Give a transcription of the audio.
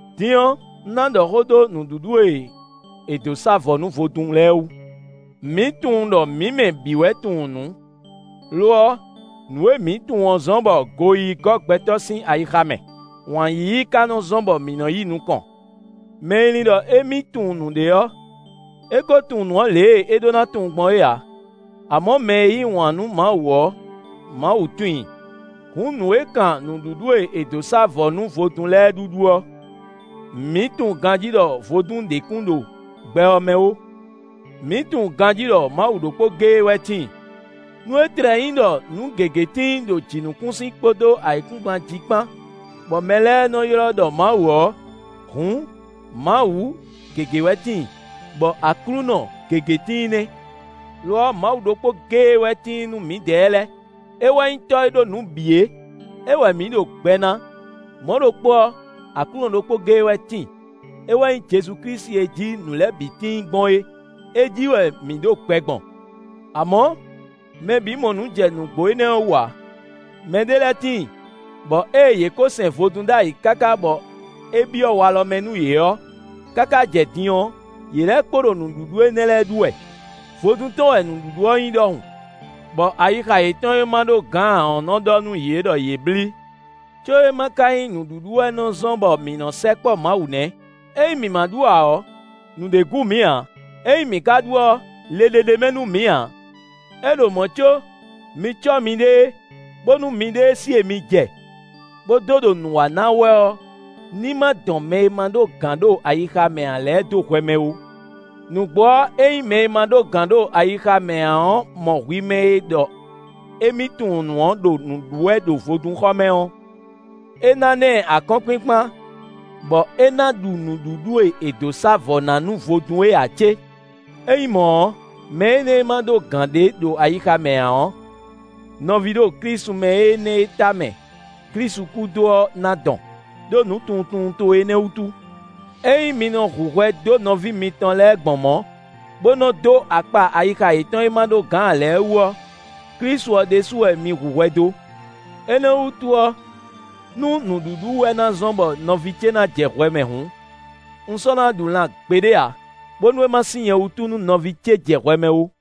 Din ɔ́, un ná ɖɔ xó dó nǔɖuɖu e è dǒ sá vɔ̌ nú vodún lɛ́ɛ wú. Mǐ tunwun ɖɔ mǐ mɛ bǐ wɛ tunwun nǔ. Lo ɔ́, nǔ e mǐ tunwun ɔ́ zɔ́n bɔ goyíyí gɔ́ gbɛtɔ́ sín ayixa mɛ; wǎn yíyí ka nɔ zɔ́n bɔ mǐ nɔ yi nukɔn. Mɛ e lin ɖɔ émí tunwun nǔɖé ɔ́, é ko tunwun nǔ ɔ́ lě e é ɖó ná tunwun gbɔn é ǎ. Amɔ̌ mɛ e yí wǎn nú Mawu ɔ́, Mawu tunwun i. Hǔn nǔ e kan nǔɖuɖu e è dǒ sá vɔ̌ nú vodún lɛ́ɛ ɖuɖu ɔ́, mǐ tunwun ganjí ɖɔ vodún ɖě kún ɖo gbɛ ɔ́ mɛ ó; mǐ tunwun ganjí ɖɔ Mawu ɖokpó géé wɛ tíin. Nú é tlɛ nyí ɖɔ nǔ gěgé tíin ɖo jǐnukúnsin kpódó ayǐkúngban jí kpán, bɔ mɛ lɛ́ɛ nɔ ylɔ́ ɖɔ mawu ɔ́, hǔn, “mawu” gěgé wɛ tíin, bɔ “aklúnɔ” gěgé tíin nɛ́. Lo ɔ́, Mawu ɖokpó géé wɛ tíin nú mǐdɛɛ lɛ́ɛ: é wɛ nyí Tɔ́ e ɖó nǔ bǐ é; é wɛ mǐ ɖo gbɛ ná; mɔ̌ ɖokpó ɔ́, Aklúnɔ ɖokpó géé wɛ tíin; é wɛ nyí Jezu Klísu e jí nǔ lɛ́ɛ bǐ tíin gbɔn é; é jí wɛ mǐ ɖo gbɛ gbɔn. Amɔ̌, mɛ bǐ mɔ nǔ jɛ nǔgbó énɛ́ wú ǎ. Mɛ ɖé lɛ́ɛ tíin, bɔ ée yě ko sɛn vodún ɖ'ayǐ káká bɔ é byɔ́ walɔ mɛ nú yě ɔ́, káká jɛ din ɔ́, yě lɛ́ kpo ɖo nǔɖuɖu énɛ́ lɛ́ɛ ɖu wɛ, vodún tɔn wɛ nǔɖuɖu ɔ́ nyí ɖɔhun, bɔ ayixa yětɔn e má ɖó gǎn ǎ ɔ́ nɔ́ ɖɔ nú yě ɖɔ yě blí. Có é ma ka nyí nǔɖuɖu wɛ nɔ zɔ́n bɔ mǐ nɔ́ sɛkpɔ́ Mawu nɛ́; ényí mǐ ma ɖu ǎ ɔ́, nǔɖé gú mǐ ǎ; ényí mǐ ka ɖu ɔ́, le ɖé ɖ'é mɛ nú mǐ ǎ. É ɖo mɔ̌ có, mi cɔ́ miɖée, bónú miɖée sí e mi jɛ, bó dó ɖo nǔ wa ná wɛ ɔ́ ní ma dɔn mɛ e ma ɖó gǎn ɖo ayixa mɛ ǎ lɛ́ɛ dó hwɛ mɛ ó. Nǔgbó ɔ́, ényí mɛ e ma ɖó gǎn ɖo ayixa mɛ ǎ ɔ́ mɔ hwi mɛ e ɖɔ émí “tunwun nǔ” ɔ́ ɖo nǔ ɖu wɛ ɖo vodúnxɔ mɛ ɔ́, é ná ná ɛ akɔ́nkpinkpan, bɔ é ná ɖu nǔɖuɖu e è dǒ sá vɔ̌ ná nú vodún é ǎ cé? É nyí mɔ̌ ɔ́, mɛ énɛ́ e ma ɖó gǎn ɖé ɖo ayixa mɛ ǎ ɔ́, nɔví ɖo Klísu mɛ énɛ́ e tamɛ Klísu kú dó ɔ́ ná dɔn, ɖó “nǔtunwuntunwun towe énɛ́” wútu! Ényí mi nɔ hu hwɛ dó nɔví mitɔn lɛ́ɛ gbɔn mɔ̌, bó nɔ dó akpa ayixa yětɔn e má ɖó gǎn lɛ́ɛ wú ɔ́, Klísu ɔ́ ɖésú wɛ mi hu hwɛ dó. Énɛ́ wútu ɔ́, nú nǔɖuɖu wɛ ná zɔ́n bɔ nɔví ce ná jɛ hwɛ mɛ hǔn, un sɔ́ ná ɖu lan gbeɖé ǎ, bónú é ma sín nyɛ wútu nú nɔví ce jɛ hwɛ mɛ ó.